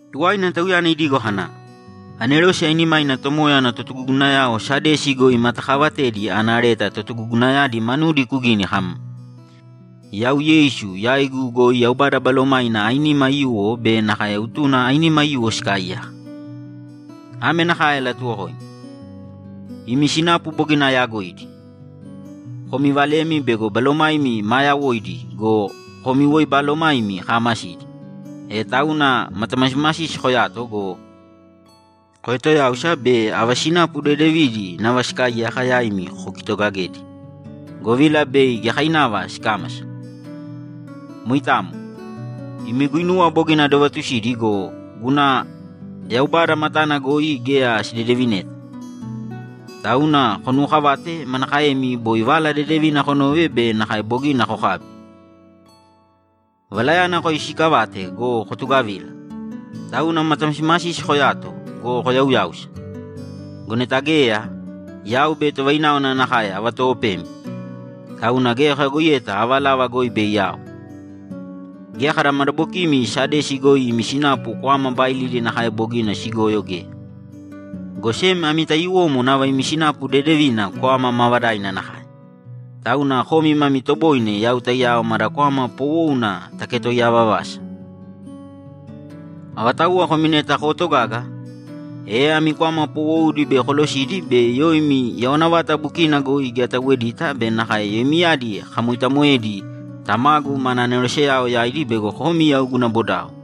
Tuwaina Tauyana idigo kana, ‘Anerose ainimaina Tomoya ana totugugunayao Sadesi goi imatakaavatedi ana leta totugugunayadi manudi kugīni kam, “Yau Yeisu yaigu goi Yaubada Balomaina ainima aiyuwo be nakae utuna ainima aiyuwo sikaaiyaka. Ame nakae alatuwokoimi: Imi sinapu bogina ayaagoidi. Komi valemi bego balomaimi maa yawoidi go, komi woi balomaimi kaamasidi! E tauna matamasimasisi koyāto go, koetoyāusa be ava sinapuva dedevidi nava sikaaiyaka yaimi kokitogagēdi, govila bei giyakainava sikámasa. Moitamo. Imi guinuwa bogina adovatusidi go, guna Yaubada matana goi geya sidedevineta. Tauna konuwookavāte manakaemi boi Vala Dedevina konove be nakae bogina kokabi. Valayana koyoisiikavāte go, kotugavīla. Tauna matamasimasisi koyāto go, koyauyāusa! Go neta geya, yau bei tovaináwana nakae avatoopemi, tauna geya koyagoiyeta ava lava goi bei ao. Geya kada madabokimi Sadesi goi imi sinapu kwama baailidi nakae bogina sigoyo geya, go sem ami taiyuwomo nava imi sinapu dedevina kwama maavadaina nakae, tauna komi mami toboine yau taiyao mada kwama poowouna taketoiyaa vavasa. Avatauwa komi neta kootogaga, e ami kwama poowoudi bei kolosidi be yoimi yawana vata bukina goi geya atauwedita be nakae yoimiyadi akamoitamoedi Tamagu mana aneroseyao yaidi bego komi yau guna bodao.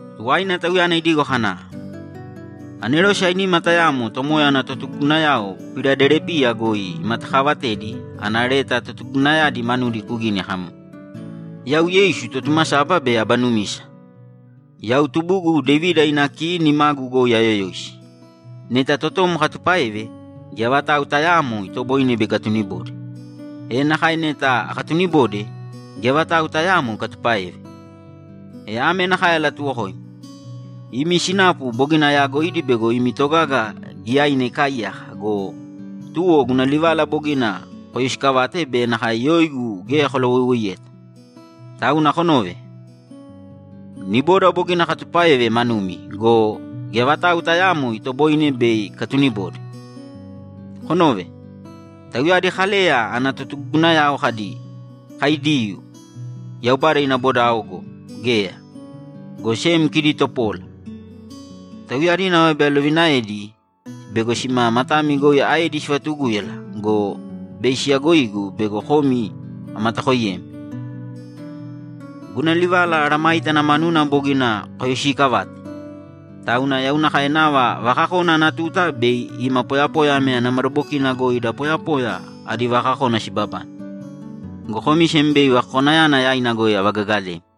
Tuwaina Tauyana idigo kana, ‘Anerose ainima tayamo Tomoya ana totugugunayao Piladelipiya goi imatakaavatedi ana leta totugugunayadi manudi kugīni kam, “Yau Yeisu Totumasaba be Aba Numisa. Yau tubugu Devida ina ki nimagu goi ayoyoisi. Neta totom akatupáeve, geya vatau tayaamo itoboine bei ikatunibode, e nakae neta akatunibode, geya vatau tayaamo ikatupáeve. E ame nakae alatuwokoimi: Imi sinapu bogina ayaagoidi bego imi togaga giyaina ikaaiyaka go, tuwo guna livala bogina koyoisikavate be nakae yoigu geya kolawoiwoiyeyeta. Tauna konōve! Niboda bogina akatupáeve manumi go, geya vatau tayaamo itoboine bei ikatunibode. Konōve! Tauyadi Kaleya ana totugugunayao kadi, ‘Kai Diyuu, Yaubada ina bodao’ go, geya, go sem kidi topola. Tauyadi nava bei alovinaedi bego sima matami goi aedi sivatugúyala go, bei siyagoigu bego komi amatakooiyemi. Guna livala mesayágana manuna bogina koyoisiikavate, tauna yau nakae nava vakakona ana tuta bei ima poyapoya ana madabokina goi da poyapoya adi vakakona sibabane, go komi sem bei vakakonayana yaina goi avagagalemi.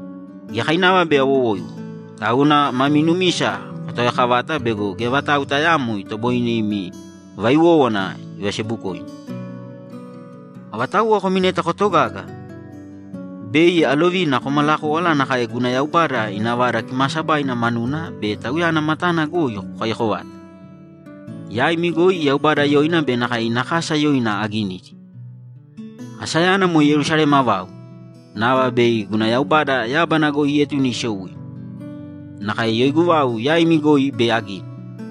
Giyakainava bei awowoiwo, tauna mami numisa kotaoyaakavāta bego geya vatau tayaamo itoboine imi vaiwówana ivasebukoimi. Avatauwa komi neta kootogaga, bei alovina komalakówala nakae guna Yaubada ina Vada Kimaasabaina manuna be Tauyana matana goi kokaiyako vata. Yaimi goi Yaubada yoina be nakae ina kasa yoina aginidi; asayana moe Yerusalema vau, nava bei guna Yaubada yábana goi ietune isou ima. Nakae yoigu vau yaimi goi bei agini.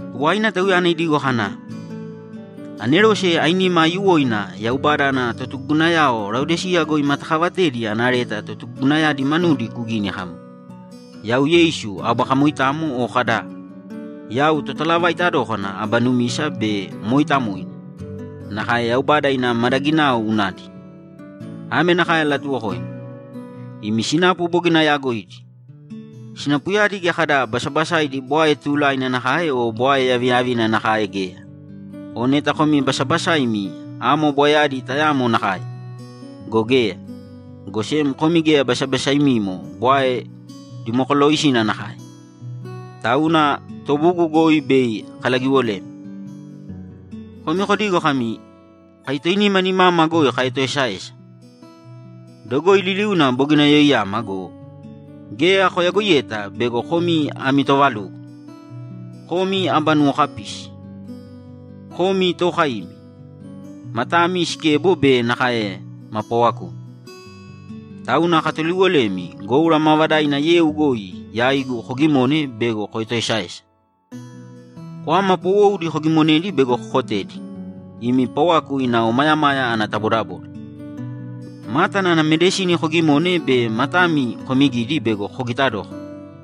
Tuwaina Tauyana idigo kana, ‘Anerose ainima aiyuwoina Yaubada ana totugugunayao Laodiseya goi imatakaavatedi ana leta totugugunayadi manudi kugīni kam, “Yau Yeisu Aba Kamoitamo o kada, ‘Yau Totalavaita dókana Aba Numisa be Mooitamoina, nakae Yaubada ina madaginao unadi.’ Ame nakae alatuwokoimi: Imi sinapu bogina ayaagoidi. Sinapuyadi geya kada basabasaidi bwae tuulaina nakae o bwae yaviyavina nakae geya. O neta komi basabasaimi amo bwaeyadi tayamo nakae! Go geya, go sem komi geya basabasaimimo bwae dimokolooisina nakae, tauna tobugu goi bei akalagiwolemi. Komi kodigo kami, ‘Kai toinima nimama goi kaetoesaesa. Dogoi liliuna bogina yoiyama’ go, geya koyagoiyeta bego komi ami toovalugo, komi aba nuwokapisi, komi tookaimi, matami sikebo be nakae ma paawakumi. Tauna akatuliwolemi goura maavadaina yeu goi yaigu kogimōne bego koetoesaesa. Kwama poowoudi kogimonēdi bego kokotedi, imi pawaku ina omayamaya ana tabodaboda. Mátana ana medisini kogimōne be matami komigīdi bego kogita dókana.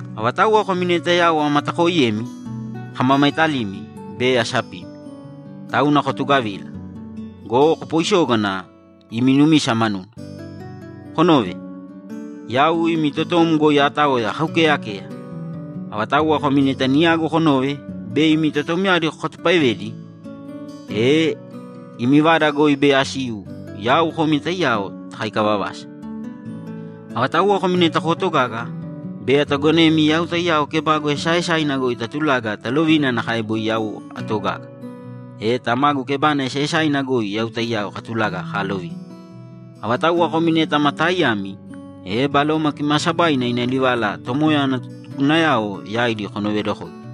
Avatauwa komi neta yau amatakooiyemi, akamamaetalimi be asapimi. Tauna kotugavīla go, kopooisōgana imi numisa manuna. Konōve! Yau imi totom goi aataoya akaukeeyakeya. Avatauwa komi neta niyagu konove be imi totomyadi kokatupaevedi, e imi vada goi bei asiu yau komi taiyao takáika vavasa. Avatauwa komi neta kootogaga, bei atagonemi yau taiyao kebagu esaaesaina goi tatulaga talovina nakae boi yau atogaga, e Tamagu kebana esaaesaina goi yau taiyao katulaga kaalovina. Avatauwa komi neta ma taaiyami, e Baloma Kimaasabaina ina livala Tomoya ana totugugunayao yaidi konoveedokōidi!”’